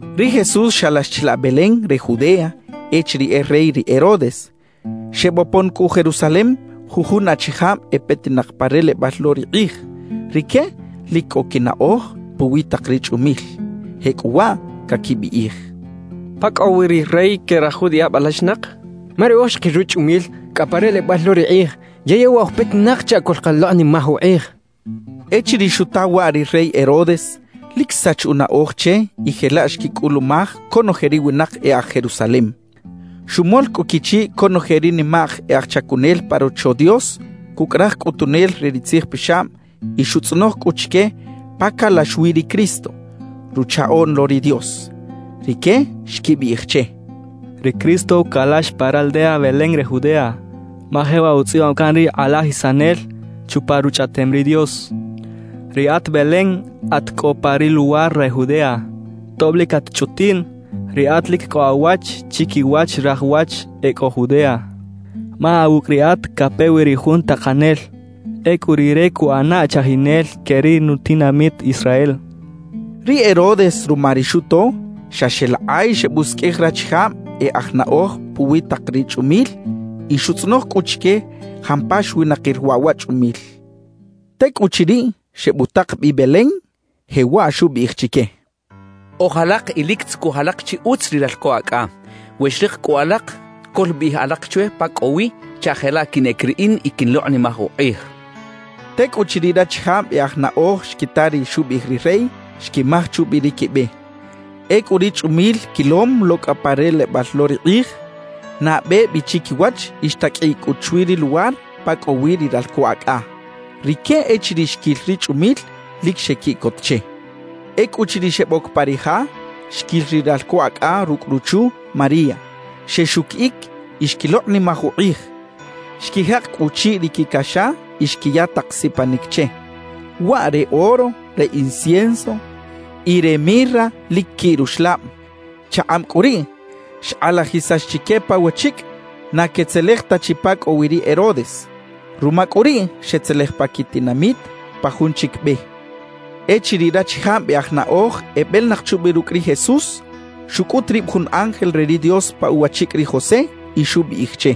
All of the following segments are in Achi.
Ri Jesús xalax chilaꞌ Belén re Judea echiriꞌ e rey ri Herodes. Xebopon cꞌu Jerusalem jujun achijab e petinak pa relebal lo ri kꞌij. Rique lic cꞌo quinaꞌoj puwi tak ri chꞌumil. Jecꞌuwaꞌ caquibiꞌij: —¿Pa cꞌo wi ri rey que raj judiꞌab alaxinak? Ma riꞌoj xkil ruchꞌumil cꞌa pa relebal lo ri kꞌij; yey e waꞌ oj petinak chaꞌ coꞌlkalokꞌnimaj ukꞌij —quechaꞌ. Echiriꞌ xuta waꞌ ri rey Herodes, lic xsach unaꞌoj che y jelaꞌ xquicꞌulumaj conoje ri winak e aj Jerusalem. Xumol cꞌu quichiꞌ conoje ri nimak e aj chacunel pa Rocho Dios cucꞌ raj cꞌutunel re ri tzijpixab y xutzꞌonoj cꞌu chique pa calax wi ri Cristo, Ruchaꞌoꞌn lo ri Dios. Rique xquibiꞌij che: —Ri Cristo calax pa raldea Belén re Judea, ma jewaꞌ utzꞌibam can ri kꞌalajisanel chupa Ruchꞌaꞌtem ri Dios: Riꞌat Belén at cꞌo pa ri luwar re Judea, tob lic at chꞌutiꞌn, riꞌat lic cꞌo awach chiquiwach raj wach e cꞌo Judea, ma awucꞌ riꞌat cape wi ri Jun Takanel; ecꞌu Rire cuꞌana chajinel que ri nutinamit Israel —xechaꞌ. Ri Herodes ruma ri xuto, xa xeꞌlakꞌay xebusiqꞌuij rachijab e aj naꞌoj puwi tak ri chꞌumil y xutzꞌonoj cꞌu chique jampa xwinakir waꞌ wa chꞌumil. Tecꞌuchiriꞌ, xebutak bi Belén, jewaꞌ xubiꞌij chique: —Oj alak y lic tzucuj alak chi utz ri ralco acꞌa. We xrik cꞌu alak, coꞌlbiꞌij alak chwe pa cꞌo wi chaꞌ jelaꞌ quinꞌec riꞌin y quiꞌnlokꞌnimaj ukꞌij —xchaꞌ. Tecꞌuchiriꞌ rachijab e aj naꞌoj xquita ri xubiꞌij ri rey, xquimaj chubi ri quibe. Ecꞌu ri chꞌumil quilom lo cꞌa pa relebal lo ri kꞌij, nabe bi chiquiwach y xtaqꞌuiꞌ cꞌu chwi ri luwar pa cꞌo wi ri ralco acꞌa. Rique echiriꞌ xquil ri chꞌumil, lic xequiꞌcot che. Ecꞌuchiriꞌ xeboc pa ri ja, xquil ri ralco acꞌa rucꞌ ruchu María. Xexuquiꞌic y xquilokꞌnimaj ukꞌij. Xquijak cꞌu uchiꞌ ri quicaxa y xquiya tak sipanic che, waꞌ re oro, re incienso y re mirra lic quiꞌ ruxlab. Chakꞌab cꞌu riꞌ, xkꞌalajisax chique pa wachicꞌ na quetzelej ta chi pa cꞌo wi ri Herodes. Ruma cꞌu riꞌ, xetzelej pa quitinamit pa jun chic be. Echiriꞌ rachijab e aj naꞌoj ebelinak chubi rucꞌ ri Jesús, xucꞌut rib jun ángel re ri Dios pa uwachicꞌ ri José y xubiꞌij che: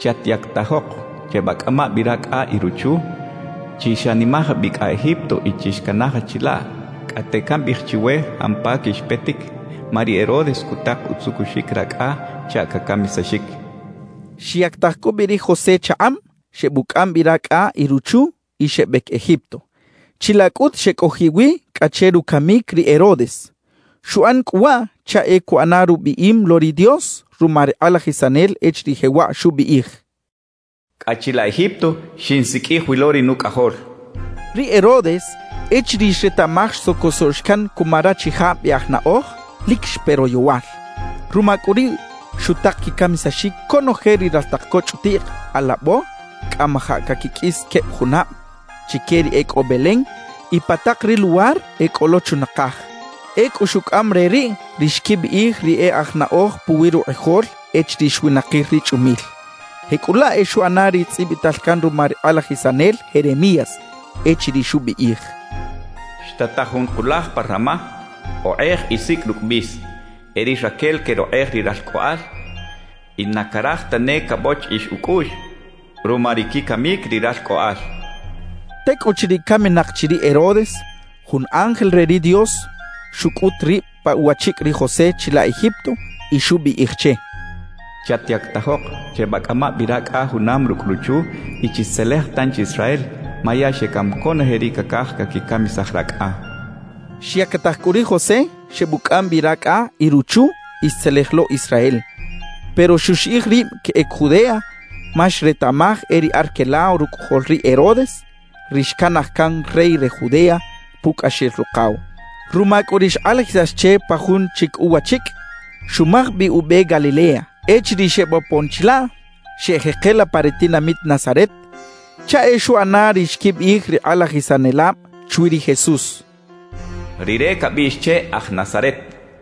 «Chatyactajok, chebacꞌama bi racꞌa y ruchu. Chixanimaj bi cꞌa Egipto y chixcanaja chilaꞌ cꞌate cambiꞌij chiwe jampa quixpetic, ma ri Herodes cutak utzucuxic racꞌa chaꞌ cacamisaxic» xchaꞌ. Xyactaj cꞌu bi ri José chakꞌab, xebucꞌam bi racꞌa y ruchu, y xebec Egipto. Chilaꞌ cꞌut xecꞌojiꞌ wi cꞌa che rucamic ri Herodes. Xuꞌan cꞌu waꞌ chaꞌ e cuꞌana rubiꞌim lo ri Dios ruma ri kꞌalajisanel echiriꞌ jewaꞌ xubiꞌij: «Cꞌa chilaꞌ Egipto xinsiqꞌuij wi lo ri Nucꞌajol» xchaꞌ. Ri Herodes, echiriꞌ xretaꞌmaj xsocosoꞌx can cuma rachijab e aj naꞌoj, lic xpe royowal. Ruma cꞌu riꞌ, xutak quicamisaxic conoje ri raltak co chꞌutiꞌk alabo cꞌamajaꞌ caquiqꞌuis queb junab, chique ri e cꞌo Belén y pa tak ri luwar e cꞌo lo chunakaj. Ecꞌu xucꞌam re riꞌ ri xquibiꞌij ri e aj naꞌoj puwi rukꞌijol echiriꞌ xwinakir ri chꞌumil. Jecꞌulaꞌ e xuꞌana ri tzꞌibital can ruma ri kꞌalajisanel Jeremías echiriꞌ xubiꞌij: Xtataj jun kulaj pa Ramá, okꞌej y sicꞌ rucꞌ bis. E ri Raquel querokꞌej ri ralcꞌoꞌal y na caraj tane cabochiꞌix ucꞌuꞌx ruma ri quicamic ri ralcꞌoꞌal xchaꞌ. Tecꞌuchiriꞌ caminak chi ri Herodes, jun ángel re ri Dios xucꞌut rib pa uwachicꞌ ri José chilaꞌ Egipto y xubiꞌij che: «Chatyactajok, chebacꞌama bi racꞌa junam rucꞌ ruchu y chixtzelej tanchi Israel, ma ya xecam conoje ri cacaj caquicamisaj racꞌa» xchaꞌ. Xyactaj cꞌu ri José, xebucꞌam bi racꞌa y ruchu, y xtzelej lo Israel. Pero xuxiꞌij rib queꞌec Judea, ma xretaꞌmaj e ri Arquelao rucꞌajol ri Herodes ri xcanaj can rey re Judea pucꞌaxel rukaw. Ruma cꞌu ri xkꞌalajisax che pa jun chic uwachicꞌ, xumaj bi ube Galilea. Echiriꞌ xebopon chilaꞌ, xeꞌjekela pa ri tinamit Nazaret, chaꞌ e xuꞌana ri xquibiꞌij ri kꞌalajisanelab chwi ri Jesús: “Rire cabiꞌx che aj Nazaret.”